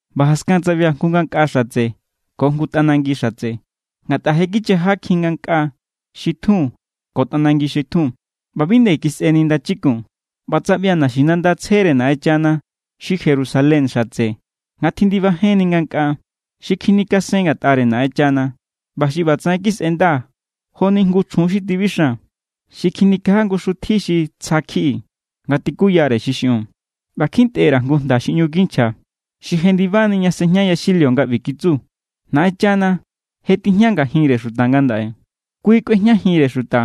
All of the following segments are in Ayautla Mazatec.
ꞌBa jaskan tsaꞌbia̱ jngu ngankꞌa xatse ko jngu tꞌanangi xatse, ngatꞌa je kichajakjin ngankꞌa xi tjun ko tꞌanangi xi tjun. ꞌBa bi nde kisꞌeni ndachikun. ꞌBa tsaꞌbia̱ naxinanda tsjere Naꞌenchana, xi Jerusalén xatse, nga tjindibajenni ngankꞌaa. Xi kjinikasen ngatꞌare Naꞌenchana ꞌba xi ꞌbatsaꞌen kisꞌenda joni jngu chjun xi tibixan xi kjinikaja jngu xutji xi tsja=kjiꞌi nga tikuyare xi xiꞌiun. ꞌBa kjintꞌe_ra̱ jngu jnda xi ꞌñu kinchja, xi jendibani ña sejña yaxilio nga ꞌbi kitsu: “Naꞌenchana je tijña ngajinre xuta ngandaꞌe. Kui kꞌuejñajinre xuta,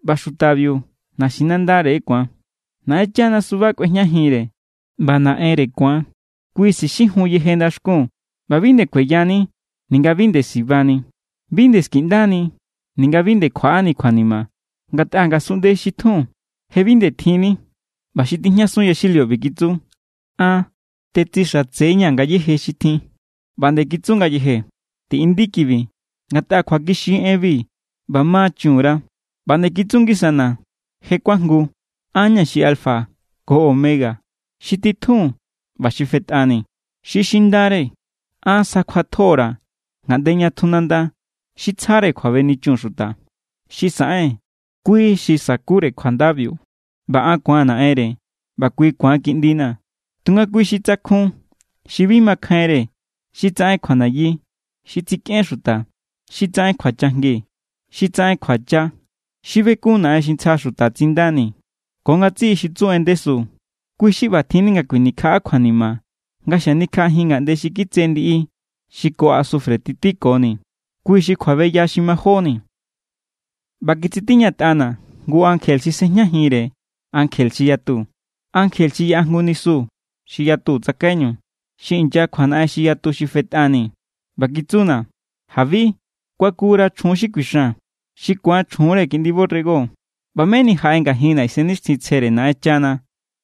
ꞌba xutabiu naxinandare ku̱an. Naꞌenchana suba kꞌuejñajinre ꞌba ku̱an Naꞌenre. Kui sixijun yeje ndaxkun, ꞌba bi nde kueyani ninga bi nde sibani. Bi nde skiꞌndani ninga bi nde kjuaꞌani kjuanima, ngatꞌa ngasunꞌnde xi tjun je bi nde tjinni.” ꞌBa xi tijñasun yaxilio ꞌbi kitsu: “An tetsixatse=ña̱ ngayéje xi tjin.” ꞌBa nde kitsu ngayeje: “Tiꞌindi kibi, ngatꞌa kjuakixi= enbi ꞌba ma chun_ra.” ꞌBa nde kitsu ngisana̱: “Je kuajngu. An= ña̱ xi alfa ko omega, xi titjun ꞌba xi fetꞌani. Xi xindare an sjakjuatjo_ra̱ ngaꞌnde ña tju nanda xi tsjare kjuabenichun xuta. Xi saꞌen, kui xi sa̱kure kjuandabiu. ꞌBa an ku̱aa̱n Naꞌenre ꞌba kui ku̱an kiꞌndina̱. Tunga kui xi tsakjun, xi bi makjainre, xi tsaꞌen kjuanayi, xi tsikꞌen xuta, xi tsaꞌen kjuachajngi, xi tsaꞌen kjuacha, xi bekun naꞌen xi ntsja xuta tsindani, ko ngatsiꞌi xi tsu en ndesu, kui xi ꞌba tjinni nga kjuinikjaꞌa kjuanima nga xanikjaꞌajin ngaꞌnde xi kitse ndiꞌi xi ko asufre titíkoni. Kui xi kjuabeya xi majóni.” ꞌBa kitsitiñatꞌana̱ jngu ankje xi sꞌejñajinre ankje xi yatu, ankje xi yaꞌa jngu nisu xi yatu tsakaiñu xi inya kjuanaꞌen xi yatu xi fetꞌani. ꞌBa kitsuna̱: “Jabi. Kuakura̱ chjun xi kuixan xi ku̱an chjunre Kiꞌndi borrego.” ꞌBa meni jaꞌe ngajinna̱ Isennixtjintsjere Naꞌenchana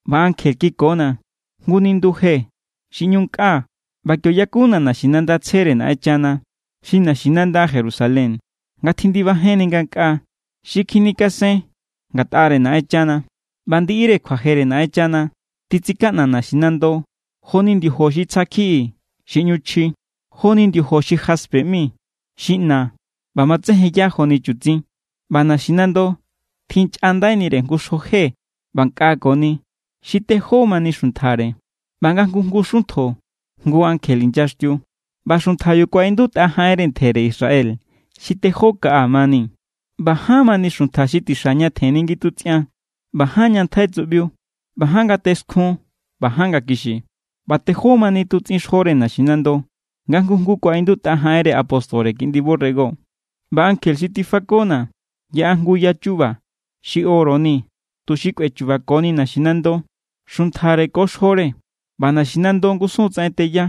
ꞌba ankje kikona̱ jngu nindu je xi ꞌñu nkꞌa. ꞌBa kio yakuna̱ naxinanda tsjere Naꞌenchana, xi naxinanda Jerusalén, nga tjindibajenni ngankꞌaa. Xi kjinikasen ngatꞌare Naꞌenchana. ꞌBa ndiꞌire kjuajere Naꞌenchana titsikaꞌna naxinando joni ndiojo xi tsja kjiꞌi xi ꞌñu chji. Jo=ni ndiojo xi jaspe ꞌmi, xi ꞌna ꞌba matsejenya joni chutsin. ꞌBa naxinando tjinchꞌandaire jngu xjo je ꞌba nkꞌakoni, xi tejó mani xuntjare. ꞌBa nga jngu jngu xuntjo jngu ankje inyaxtiu. ꞌBa xuntjabiu kuaꞌindutꞌa jaꞌenre ntjere Israel xi tejó kaꞌa mani. ꞌBa ján mani xuntja xi tixa ña tjenni ngitutsꞌian ꞌba ján ña ntjai tsuꞌbiu ꞌba ján ngate skjun ꞌba ján ngakixi. ꞌBa tejó mani tutsꞌin xjore naxinando. Nga jngu jngu kuaꞌindutꞌa jaꞌenre apóstore Kiꞌndi borrego. ꞌBa ankje xi tifakona̱ yaꞌa jngu ya chu̱ba̱ xi oro ni tuxi kꞌuechu̱ba̱koni naxinando, xuntjare ko xjore. ꞌBa naxinando ngusun= tsaꞌen teya.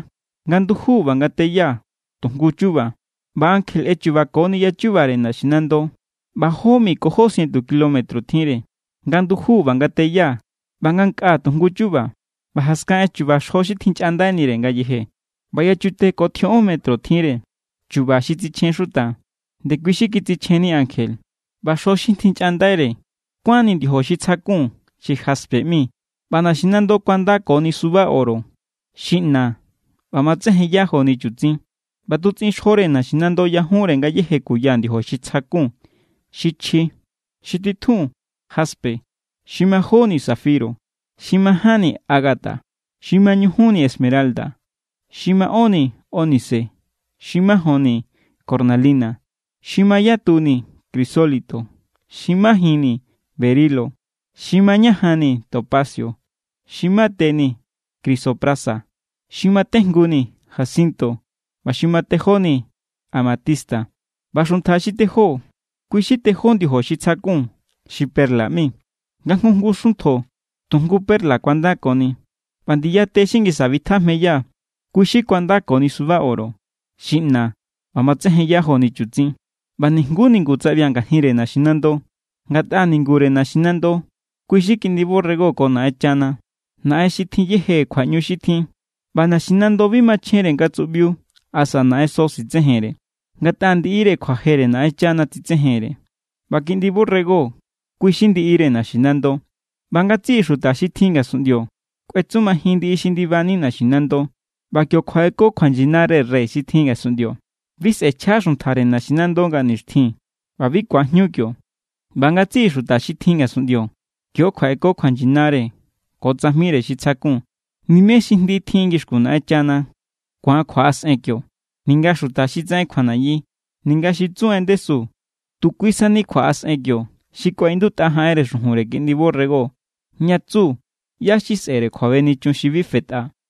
Nga nduju ꞌba nga teya tu jngu= chuba. ꞌBa ankje ꞌechubakoni yachubare naxinando, ꞌba jó mi ko jó sientu kilómetro tjinre. Nga nduju ꞌba nga teya ꞌba nga nkꞌa tu jngu chuba. ꞌBa jaskan ꞌechu̱ba̱ xjo xi tjinchꞌandaire ngayeje. ꞌBa yachute ko tjioꞌon metro tjinre. Chu̱ba̱ xi tsichjen xuta, ndekui xi kitsichjenni ankje. ꞌBa xjo xi tjinchꞌandaire kuánni ndiojo xi tsjakun xi jaspe ꞌmi, ꞌba naxinando kuandakoni suba oro xi ꞌna ꞌba matsejenya joni chutsin. ꞌBa tutsꞌin xjore naxinando yajunre ngayéje kuya ndiojo xi tsja kun xi chji. Xi titjun, jaspe. Xi majóni, zafiro. Xi majánni, ágata. Xi mañujunni, esmeralda. Xi maꞌónni, ónice. Xi majonni, cornalina. Xi mayatuni, crisólito. Xi majinni, berilo. Xi mañajanni, topacio. Xi mateni, crisoprasa. Xi matejnguni, jacinto. ꞌBa xi matejóni, amatista. ꞌBa xuntja xi tejó, kui xi tejó ndiojo xi tsakjun xi perla ꞌmi. Nga jngu jngu xuntjo tu jngu perla kuandakoni. ꞌBa ndiya te xi ngisa bitjajmeya, kui xi kuánkoni suba oro xi ꞌna ꞌba matsejenya joni chutsin. ꞌBa nijnguú ningu tsaꞌbia̱ ngajinre naxinando. Ngatꞌa ningure naxinando, kui xi Kiꞌndi borrego ko Naꞌenchana, Naꞌen xi tjin yeje kjuaꞌñu xi tjin. ꞌBa naxinando bi machjenre nga tsuꞌbiu asa naꞌenso sitsejenre, ngatꞌa ndiꞌire kjuajere Naꞌenchana tsitsejenre, ꞌba Kiꞌndi borrego kui xi ndiꞌire naxinando. ꞌBa ngatsiꞌi xuta xi tjin ngasunꞌndio kꞌuetsumajin ndiꞌi xi ndibani naxinando, ꞌba kio kjuaꞌeko kjuanyinare rey xi tjin ngasunꞌndio. Bi sꞌe̱chja xuntjare naxinando nga nixtjin ꞌba bi ku̱ajñu kio. ꞌBa ngatsiꞌi xuta xi tjin ngasunꞌndio kio kjuaꞌeko kjuanyinare ko tsajmire xi tsjakun. Nimé xi jndi tjin ngixkun Naꞌenchana ku̱an kjuaꞌasꞌen kio, ninga xuta xi tsaꞌen kjuanayi, ninga xi tsu en ndesu. Tu kui sani kjuaꞌasꞌen kio xi kuaꞌindutꞌa jaꞌenre xujunre Kiꞌndi borrego ña tsu ꞌyá xi sꞌe̱re kjuabenichun xi bi fetꞌa.